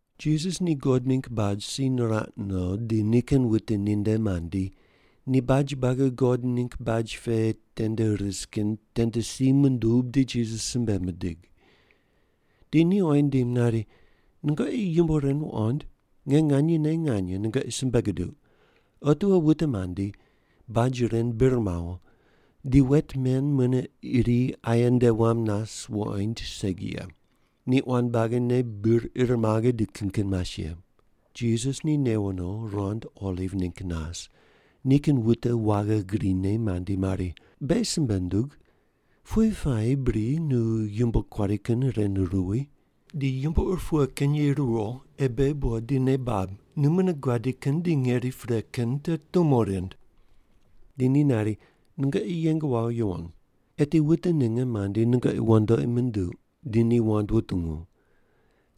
Jisas ni God ningg baj si niraq no di nikin wute ninde mandi, ni baj buagi God ningg baj pe tende rise kin tende si mundub di Jisas simbe mindig. Di ni oyi nindim nari, “Nungoqi yumbo ren wuqond? Nge nganyene nganye nungoqi simbe guduq, otiwo wute mandi baj ren bir mawo di wet men mune iri aye nde wam nas wuqoind segi ye. Ni quan buagine bir ir maghe di kin kin mas ye.” Jisas ni newo no rand oliv ningg nas, nikin wute waghi grine mandi mari, “Beghi simbe ndug, pughe puayi bri nu yumbo kuari kin ren ruwi? Di yumbo ur pughe kin ye ruwo ei beghi buqod di nei bab nu mune guadi kin di ngeri pre kin te tumo rind?” Di ni nari, “Nungoqi yeng wawo yuwon. Eti wute ninge mandi nungoqi wandoqi munduq di ni wand wutungu.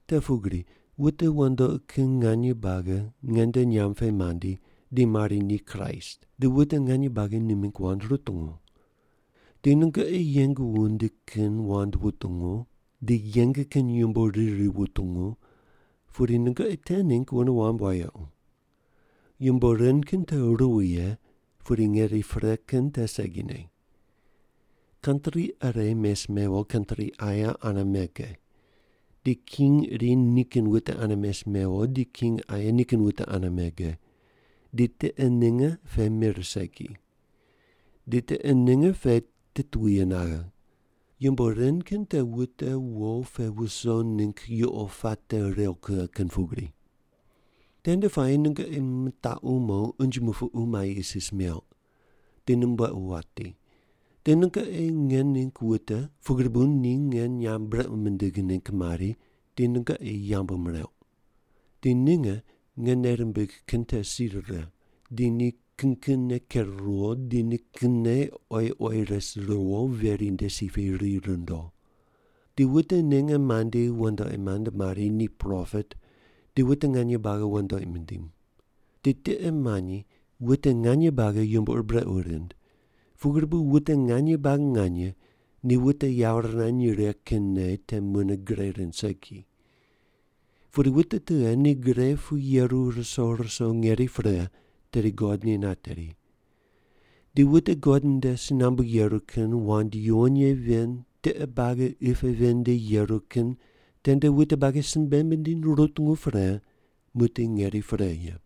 Te pugri wute wandoqi kin nganye buagi nge nde nyamb pe mandi di mari ni Kraist, di wute nganye buagi ni mingg wand rutungu. Di nungoqi yeng wundi kin wand wutungu di yeng kin yumbo riri wutungu, pudi nungoqi te ningg wune wamb wayequ. Yumbo ren kin te ruwi ye, pudi ngeri pre kin te segine. Kantri ire mes mewo kantri aye ane mege, di king iri nikin wute ane mes mewo di king aye nikin wute ane mege, di tiqe ninge pe mir segi. Di tiqe ninge pe titwuye naghe. Yumbo ren kin te wute wo pe wuso ningg yuqo puate rew kughe kin pugri. “Tende puayi nungoqi mitaqu mo unje mupuqu mai isis meuq, di mumbuequ wati, di nungoqi nge ningg wute pugri bu ni nge nyamb brequ mindigh ningg mari di nungoqi yambu mireuq. Di ninge nge nei rimbigh kin te si rire, di ni kin kinne ker ruwo di ni kinne oyi oyi res ruwo veri nde si pe ri rundo. Di wute ninge mandi wandoqi mand mari ni propet di wute nganye buagi wandoqi mindiny. Di tiqe manyi wute nganye buagi yumbo ur brequ rind, pugri bu wute nganye buagi nganye ni wute yawo rirany righe kin nei te mune gre rind segi. Pudi wute tughe ni gre pu yeru ruso ruso ngeri pre, tedi God ni nateri. Di wute God nde si nambu yeru kin wand yuwon ye ven tiqe buagi qi pe ven nde yeru kin tende wute buagi simbe mindiny rutungu pre muqdi ngeri pre ye.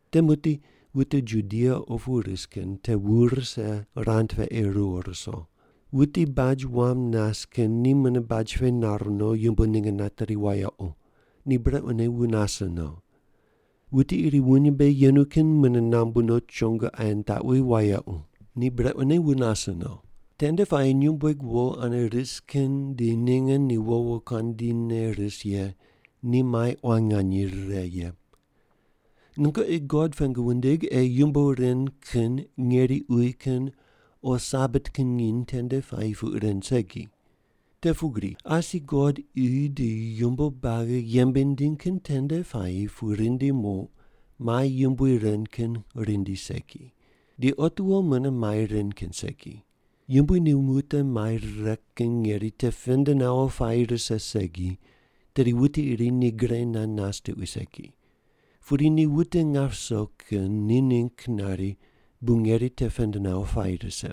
“Te muqdi wute Judia opu ris kin te wu rise rand pe ei riwo ruso. Wuti baj wam nas kin ni mune baj pe nar no yumbo ninge nateri wayequ. Ni brequne wu nase no. Wuti iri wuny mbe yenu kin mune nambu no chongo aye nitaqwi wayequ. Ni brequne wu nase no. Tende puayi nyumbueg wo ane ris kin di ninge ni wo wokuandi ne ris ye ni mai quan nganye rire ye. Nungoqi God pengu wundig ei yumbo ren kin ngeri uyi kin o Sabat kin nginy tende puayi puq ren segi. Te pugri asi God qi di yumbo buagi yembe nindiny kin tende puayi pu rindi muq mai yumbui ren kin rindi segi. Di otiwo mune mai ren kin segi. Yumbui ni wute mai rire kin ngeri te pend nawo puayi rise segi, tedi wuti iri ni gre nand nas tuqui segi. Pudi ni wute nap ruso kin ni ningg nari bu ngeri te pend nawo puayi rise.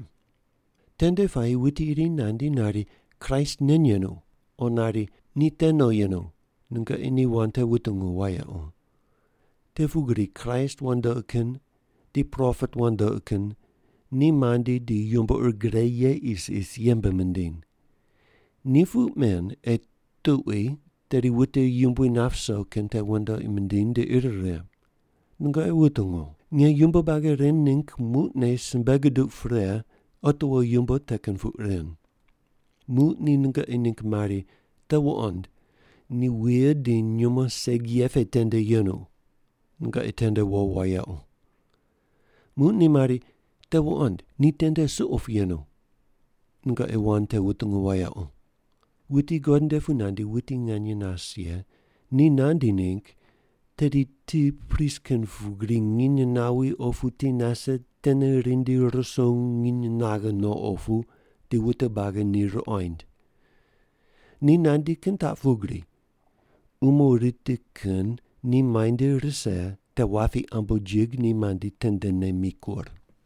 Tende puayi wuti iri nandi nari, ‘Kraist nen yenu.’ O nari, ‘Ni te no yenu.’ Nungoqi ni wand te wutungu wayequ. Te pugri Kraist wandoqi kin di propet wandoqi kin ni mandi di yumbo ur gre ye isis yembe mindiny. Ni puq men ei tuqui tedi wute Yumbui nap ruso kin te wandoqi mindiny di ir righe. Nungoqi wutungu. Nge yumbo buagi ren ningg muqne simbe guduq pre otiwo yumbo te kin puq ren. “Muq ni nungoqi ningg mari, ‘Te wuqond, ni wuye di nyumo segi ye pe tende yenu.’ Nungoqi tende wo wayequ. Muq ni mari, ‘Te wuqond, ni tende suqo pu yenu.’ Nungoqi wand te wutungu wayequ. Wuti God nde pu nandi wuti nganye nas ye ni nandi ningg tedi ti pris kin pugri nginy nawi opu ti nase tene rindi ruso nginy naghe no opu di wute buagi ni ruqoind. Ni nandi kin taq pugri, umo riti kin ni muainde rise te wapi ambojig ni mandi tendene mikur.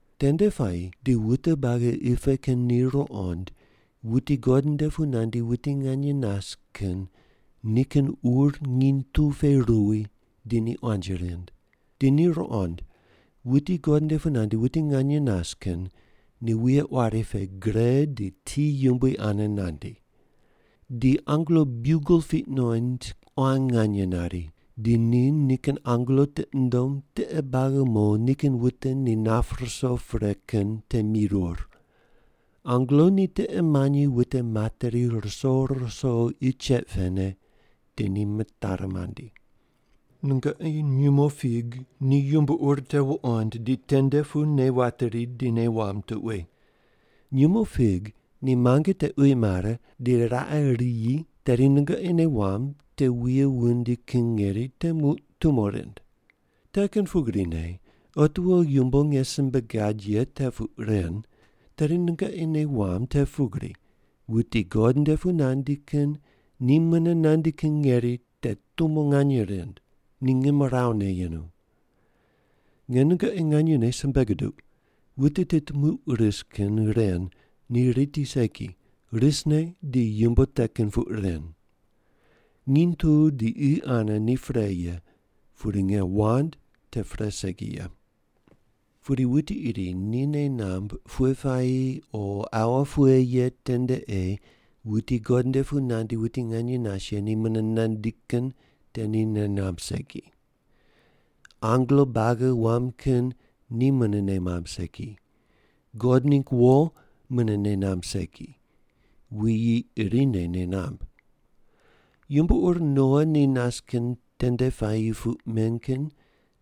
Tende puayi di wute buagi qi pe kin ni ruqond wuti God nde pu nandi wuti nganye nas kin nikin ur nginy tu pe ruwi di ni quanji rind. Di ni ruqond wuti God nde pu nandi wuti nganye nas kin ni wuye quari pe gre di ti yumbui ane nandi. Di angelo biugel piq nuqoind quan nganye nari, di ni nikin angelo tiqi nundom tiqe buagi mo nikin wute ni nap ruso pre kin te mirur. Angelo ni tiqe manyi wute materi ruso ruso qi cheq pene, di ni mitari mandi. “Nungoqi nyumo fig ni yumbo ur te wuqond di tende pu nei wateri di nei wamb tuqui. Nyumo fig ni muange te uyi mare di raqe riyi tedi nungoqi nei wamb te wuye wundi kin ngeri te muq tumo rind. Te kin pugrine otiwo yumbo nge simbe gad ye te puq ren, tedi nungoqi nei wamb te pugri wuti God nde pu nandi kin ni mune nandi kin ngeri te tumo nganye rind, ni ngimrawu ne yenu. Nge nungoqi nganyene simbe guduq, wute tit muq ris kin ren ni riti segi, risne di yumbo te kin puq ren. Nginy tu di qi ane ni pre ye, pudi nge wand te pre segi ye. “Pudi wuti iri ni nei namb pughe puayi o aua pughe ye tende ei wuti God nde pu nandi wuti nganye nas ye ni mune nandi kin te ni nei namb segi. Angelo buagi wam kin ni mune nei mamb segi, God ningg wo mune nei namb segi, wuyi irine nei namb. Yumbo ur Noa ni nas kin tende puayi puq men kin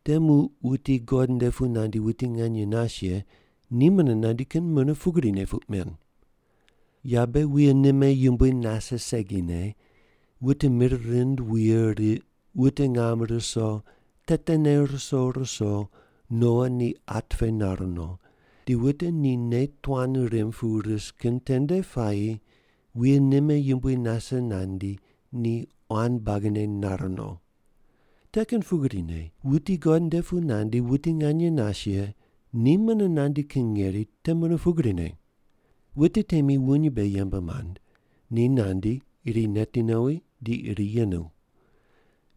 te muq wuti God nde pu nandi wuti nganye nas ye ni mune nandi kin mune pugrine puq men. Yabe wuye nime yumbui nase segine, wute mir rind wuye riq, wute ngam ruso, tetene ruso ruso Noa ni at pe nar no, di wute ni nei tuan rimb pu ris kin tende puayi wuye nime yumbui nase nandi ni quan buagine nare no. Te kin pugrine wuti God nde pu nandi wuti nganye nas ye ni mune nandi kin ngeri te mune pugrine. Wute temi wuny mbe yembe mand, ni nandi iri neti nowi di iri yenu.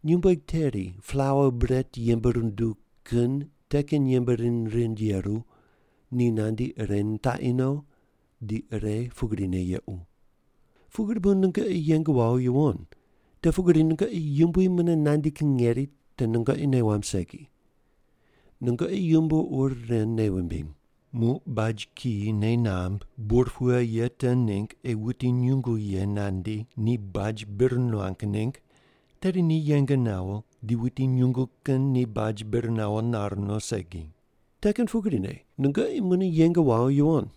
Nyumbueg teri plaua bret yembe runduw kin te kin yembe rind rind yeru, ni nandi ire nitaqi no di ire pugrine yequ. Pugri bu nungoqi yeng wawo yuwon, te pugri nungoqi Yumbui mune nandi kin ngeri te nungoqi nei wamb segi. Nungoqi yumbo ur ren nei wumbiny. Muq baj kiyi nei namb bur pughe ye te ningg ei wuti nyungu ye nandi ni baj bir nuang ningg, tedi ni yeng nawo di wuti nyungu kin ni baj bir nawo nar no segi. Te kin pugrine nungoqi mune yeng wawo yuwon,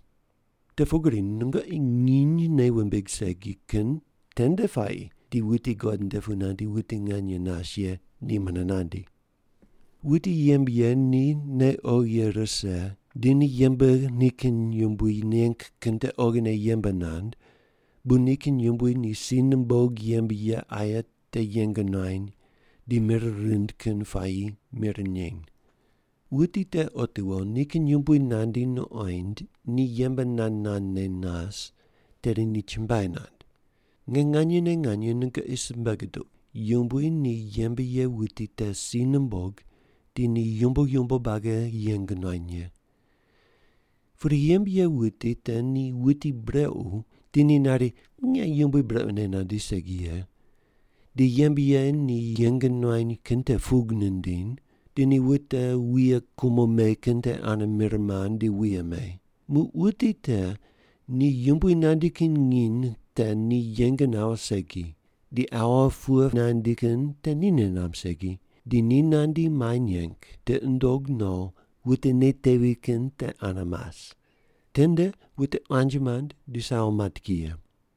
te pugri nungoqi nginy nei wumbig segi kin tende puayi di wuti God nde pu nandi wuti nganye nas ye ni mune nandi. “Wuti yembe ye ni nei oghi ye rise di ni yembe nikin yumbui neng kin te oghine yembe nand, bu nikin yumbui ni si numbog yembe ye aye te yeng nuany di mir rind kin puayi mir neny. Wuti te otiwo nikin yumbui nandi nuqoind ni yembe nand nandne nas, tedi ni chumbuai nand. Nge nganyene nganye nungoqi simbe guduq, yumbui ni yembe ye wuti te si numbog di ni yumbo yumbo buagi yeng nuany ye. Pudi yembe ye wuti te ni wuti brequ di ni nari, ‘Nge yumbui brequne nandi segi ye,’ di yembe ye ni yeng nuany kin te pug nindiny, di ni wute wuye kumo me kin te ane mir mand di wuye me. Muq wuti te ni yumbui nandi kin nginy te ni yeng nawo segi, di aua pughe ye nandi kin te ni nei namb segi, di ni nandi mai neng, tiqi nundog no wute nei tevi kin te ane mas. Tende wute quanji mand di sawo mat ki ye.”